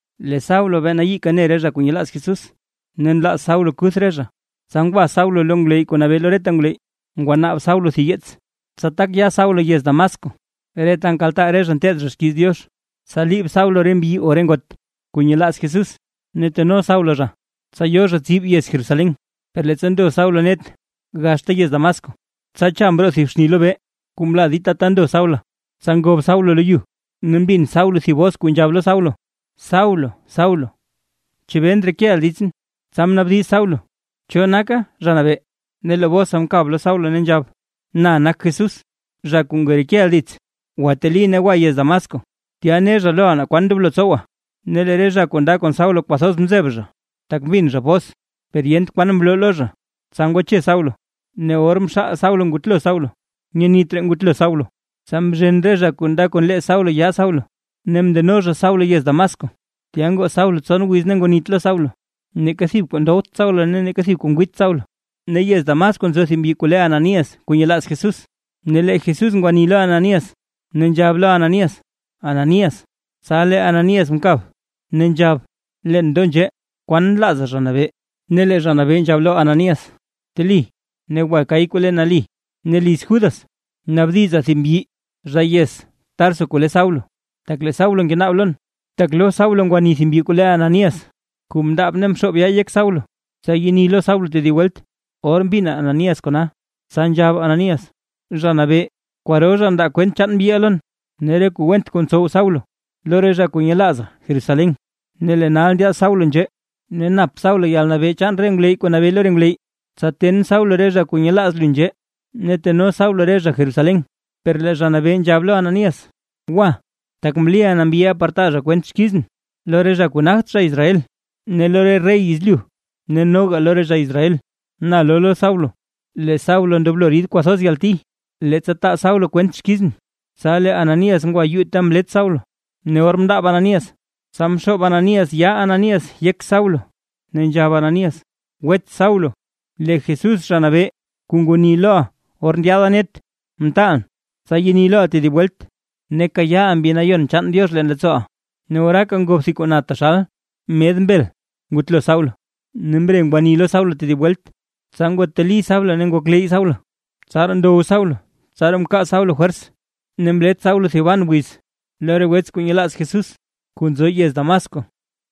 Lee Saulo be nayiika ne re zha kuu nyelaaz Jesús, ne nlaaz Saulo kuth re zha. Tsa ngwa Saulo lo ngwleyy kuu nabee lo reta ngwleyy. Ngwanaab Saulo thib yeets, tsa tak ya Saulo yez Damasco re ta nkaltaa re zha nteed zha xkiiz Diox, tsa liib Saulo mbyi na ngot kuu nyelaaz Jesús, ne teno Saulo zha tsa yo zha tsib yez Jerusalén. Per leettsa ndo Saulo net gaxta yez Damasco, tsa cha mroo thib xni lobee kuu mla dita ta ndo Saulo. Tsa ngob Saulo lo yu, ne mbin Saulo thib bos kuu nzhab lo Saulo: ―Saulo Saulo, ¿chebee ndrekeʼa ditsʼn? Tsa mnaabdiz Saulo: ―¿Cho naka Zha Nabee? Ne lee bosa mkab lo Saulo, ne nzhab: ―Na nak Jesús, zha kuu ngerekeʼa dits. Gwateli ne gwa yez Damasco, tya ne zha loʼa naa kwan ndoblo tsowa. Ne lee re zha kuu nda kon Saulo kwathoz mzeb zha, tak mbin zha bos, per yent kwan mloo lo zha. Tsa ngwache Saulo; ne or mxaal Saulo ngutlo Saulo, nyenit raa ngutlo Saulo. Tsa mzhen re zha kuu nda kon lee Saulo yaa Saulo ne mndeno zha Saulo yez Damasco. Tya ngoo Saulo tson wiz ne ngwanit lo Saulo, neeka thib kuu ndowt Saulo ne neeka thib kuu ngwiit Saulo. Ne yez Damasco nzo thib mbyi kuu le Ananías kuu nyelaaz Jesús. Ne lee Jesús ngwanii lo Ananías, ne nzhab lo Ananías: ―¡Ananías! Tsa lee Ananías mkab ne nzhab: ―Leen ndo nzhee, ¿kwan nlaaza Zha Nabee? Ne lee Zha Nabee nzhab lo Ananías: ―Bteli ne gwa kay kuu le Nali, ne liz Judas naabdiza thib mbyi zha yez Tarso kuu le Saulo, tak lee Saulo ngenaab lon. Tak lo Saulo ngwani thib mbyi kuu le Ananías, kuu mndaab ne mxoob yaa yek Saulo, tsa yeni lo Saulo tedib welt. Or mbin Ananías kona, tsa nzhab Ananías: ―Zha Nabee, kwaro zha ndaa kwent chaan mbyiʼa lon, ne re kuu went kuu ntsow Saulo lo re zha kuu nyelaaza Jerusalén. Ne lee nal ndyaad Saulo nzhee ne nap Saulo yalnabee chaan re ngwleyy kuu nabee lo re ngwleyy, tsa ten Saulo re zha kuu nyelaaz lu nzhee ne teno Saulo re zha Jerusalén. Per lee Zha Nabee nzhab lo Ananías: ―Gwa, tak mliʼa na mbyiʼa par taa zha kwent xkizʼn lo re zha kuu nagt zha Israel, ne lo re rey yezlyu, ne noga lo re zha Israel. Na loo lo Saulo lee Saulo ndoblo rid kwathoz yalti, leettsa taa Saulo kwent xkizʼn. Tsa lee Ananías ngwa yuu ta mlet Saulo, ne or mndaab Ananías, tsa mxoob Ananías yaa Ananías yek Saulo, ne nzhab Ananías: ―Wets Saulo, lee Jesús Zha Nabee kuu ngwani loʼa or ndyaada net mtaalʼn, tsa yeni loʼa tedib welt, ne kayaaʼa Mbi Nayon chaan Diox leen leettsooʼa. Ne oraaka ngob thib kuu na taxal med mbel ngutlo Saulo, ne mre ngwani lo Saulo tedib welt, tsa ngwateli Saulo ne ngokleyy Saulo. Tsaraa ndow Saulo tsaraa mkaa Saulo fwers, ne mlet Saulo thiban wiz lo re wets kuu nyelaaz Jesús kuu nzo yez Damasco.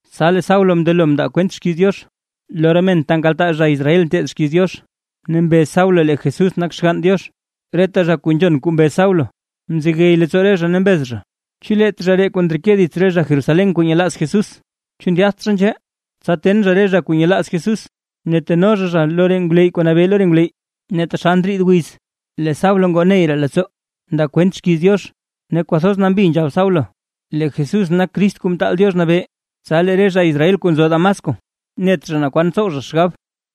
Tsa lee Saulo mndelo mndaa kwent xkiiz Diox, lo re men ta nkaltaa re zha Israel nteed xkiiz Diox, ne mbez Saulo lee Jesús nak Xgann Diox. Reta zha kuu nzhon kuu mbez Saulo; mzegey leettsoo re zha ne mbez zha: ―¿Chu leet zha ree kuu ndreke dits re zha Jerusalén kuu nyelaaz Jesús? ¿Chu ndyaadt zha nzhee, tsa ten zha re zha kuu nyelaaz Jesús ne teno zha zha lo re ngwleyy kuu nabee lo re ngwleyy? Ne taxal ndriid wiz lee Saulo ngoo ney raa leettsoo, ndaa kwent xkiiz Diox, ne kwathoz nambi nzhab Saulo lee Jesús nak Crist Kuu Mtaal Diox Nabee, tsa lee re zha Israel kuu nzo Damasco, net zha naa kwan tsow zha xgab.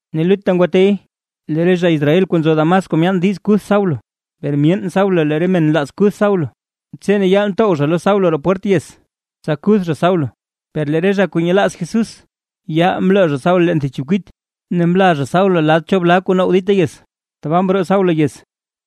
Ne lutta ngwatey lee re zha Israel kuu nzo Damasco myaan diiz kuth Saulo, per myeen Saulo lee re men nlaaz kuth Saulo. Tse ne yaal ntow zha lo Saulo roo pwert yez, tsa kuth zha Saulo. Per lee re zha kuu nyelaaz Jesús, yaal mloo zha Saulo leen thib chekwit ne mlaa zha Saulo lad cho blaa kuu now dita yez. Tbaa mroo Saulo yez.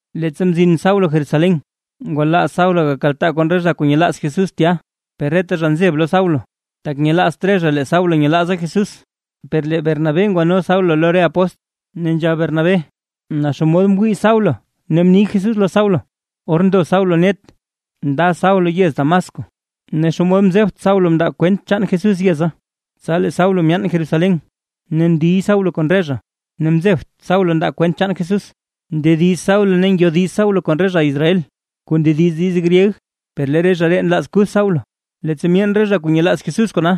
Leettsa mzin Saulo Jerusalén, ngwalaaz Saulo gakaltaa kon re zha kuu nyelaaz Jesús tya; per reta zha nzeb lo Saulo, tak nyelaazt re zha lee Saulo nyelaaza Jesús. Per lee Bernabé ngwano Saulo lo re apóstl. Ne nzhab Bernabé naa xomod mwii Saulo ne mni Jesús lo Saulo or ndo Saulo net nda Saulo yez Damasco. Ne xomod mzebt Saulo mndaa Saulo kwent chaan Jesús yeza Tsa lee Saulo myaan Jerusalén ne ndiy Saulo kon re zha. Ne mzebt Saulo ndaa kwent chaan Jesús. Ndediz Saulo ne ngyodiz Saulo kon re zha Israel kuu ndediz diiz gryeg; per lee re zha ree nlaaz kuth Saulo. Leettsa myeen re zha kuu nyelaaz Jesús kona,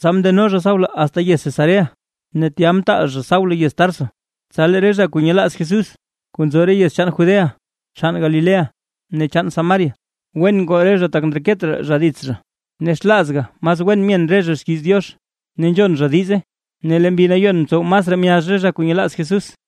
tsa mndeno zha Saulo asta yez Cesarea, ne tya mtaal zha Saulo yez Tarso. Tsa lee re zha kuu nyelaaz Jesús, kuu nzo re yez chaan Judea chaan Galilea ne chaan Samaria, wen ngoo re zha tak ndreket raa zha dits zha, ne xlaazga mas wen myen re zha xkiiz Diox ne nzhon zha diize, ne lee Mbi Nayon mtsow masraa myazh re zha kuu nyelaaz Jesús.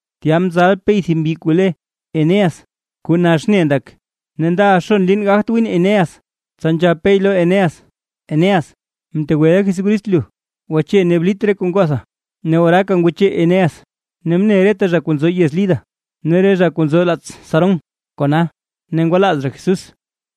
Tya mzal Pey thib mbyi kuu le Eneas, kuu nax ne ndak ne ndaʼa xon liin gagt gwin Eneas. Tsa nzhab Pey lo Eneas: ―Eneas, mtegweʼa Jesucrist lu. “Gwache ne blit daʼa”. Ne oraaka ngwache Eneas. Ne mne reta zha kuu nzo yez Lida ne re zha kuu nzo laats Sarón kona, ne ngwalaaz zha Jesús.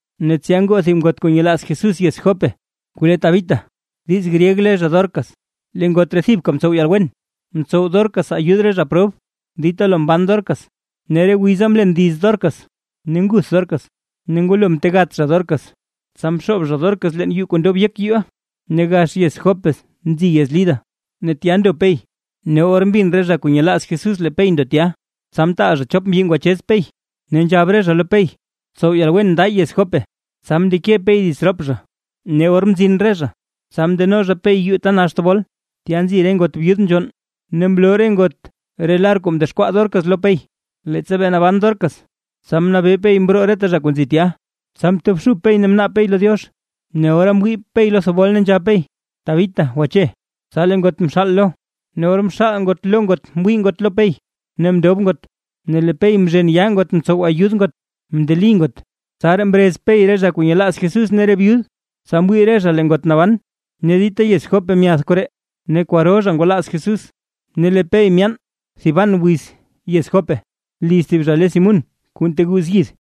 Ne tsya ngoo thib ngot kuu nyelaaz Jesús yez Jope, kuu lee Tabita (diiz gryeg le zha Dorcas). Lee ngot ree thibka mtsow yalwen, mtsow Dorcas ayud re zha prob dita lo mban Dorcas. Ne re wiza mlen liz Dorcas ne nguth Dorcas, ne ngwalo mtegat zha Dorcas, tsa mxoob zha Dorcas leen yuu kuu ndob yek yuuʼa. Ne gax yez Jope nzi yez Lida ne tya ndo Pey, ne or mbin re zha kuu nyelaaz Jesús lee Pey ndo tya, tsa mtaal zha chop mbyi ngwachez Pey, ne nzhab re zha lo Pey: ―Tsow yalwen nda yez Jope. Tsa mndeke Pey dits rop zha, ne or mzin re zha, tsa mndeno zha Pey yuu ta nax thebol, tya nzi re ngot byud nzhonn, ne mloo re ngot re lar kuu mdexkwaa Dorcas lo Pey, leettsa bee naban Dorcas. Tsa mnabee Pey mroo reta zha kuu nzi tya, tsa mtobxub Pey ne mnaab Pey lo Diox: Ne ora mwii Pey lo thebol ne nzhab Pey: ―¡Tabita, gwache! Tsa lee ngot mxaal lo, ne or mxaal ngot lo ngot mwii ngot lo Pey, ne mndob ngot. Ne lee Pey mzhen yaa ngot mtsow ayud ngot mndeli ngot, tsaraa mrez Pey re zha kuu nyelaaz Jesús ne re byud, tsa mwii re zha lee ngot naban. Ne dita yez Jope myath koree ne kwaro zha ngwalaaz Jesús. Ne lee Pey myaan thiban wiz yez Jope liz thib zha le Simún kuu nteguuz yid.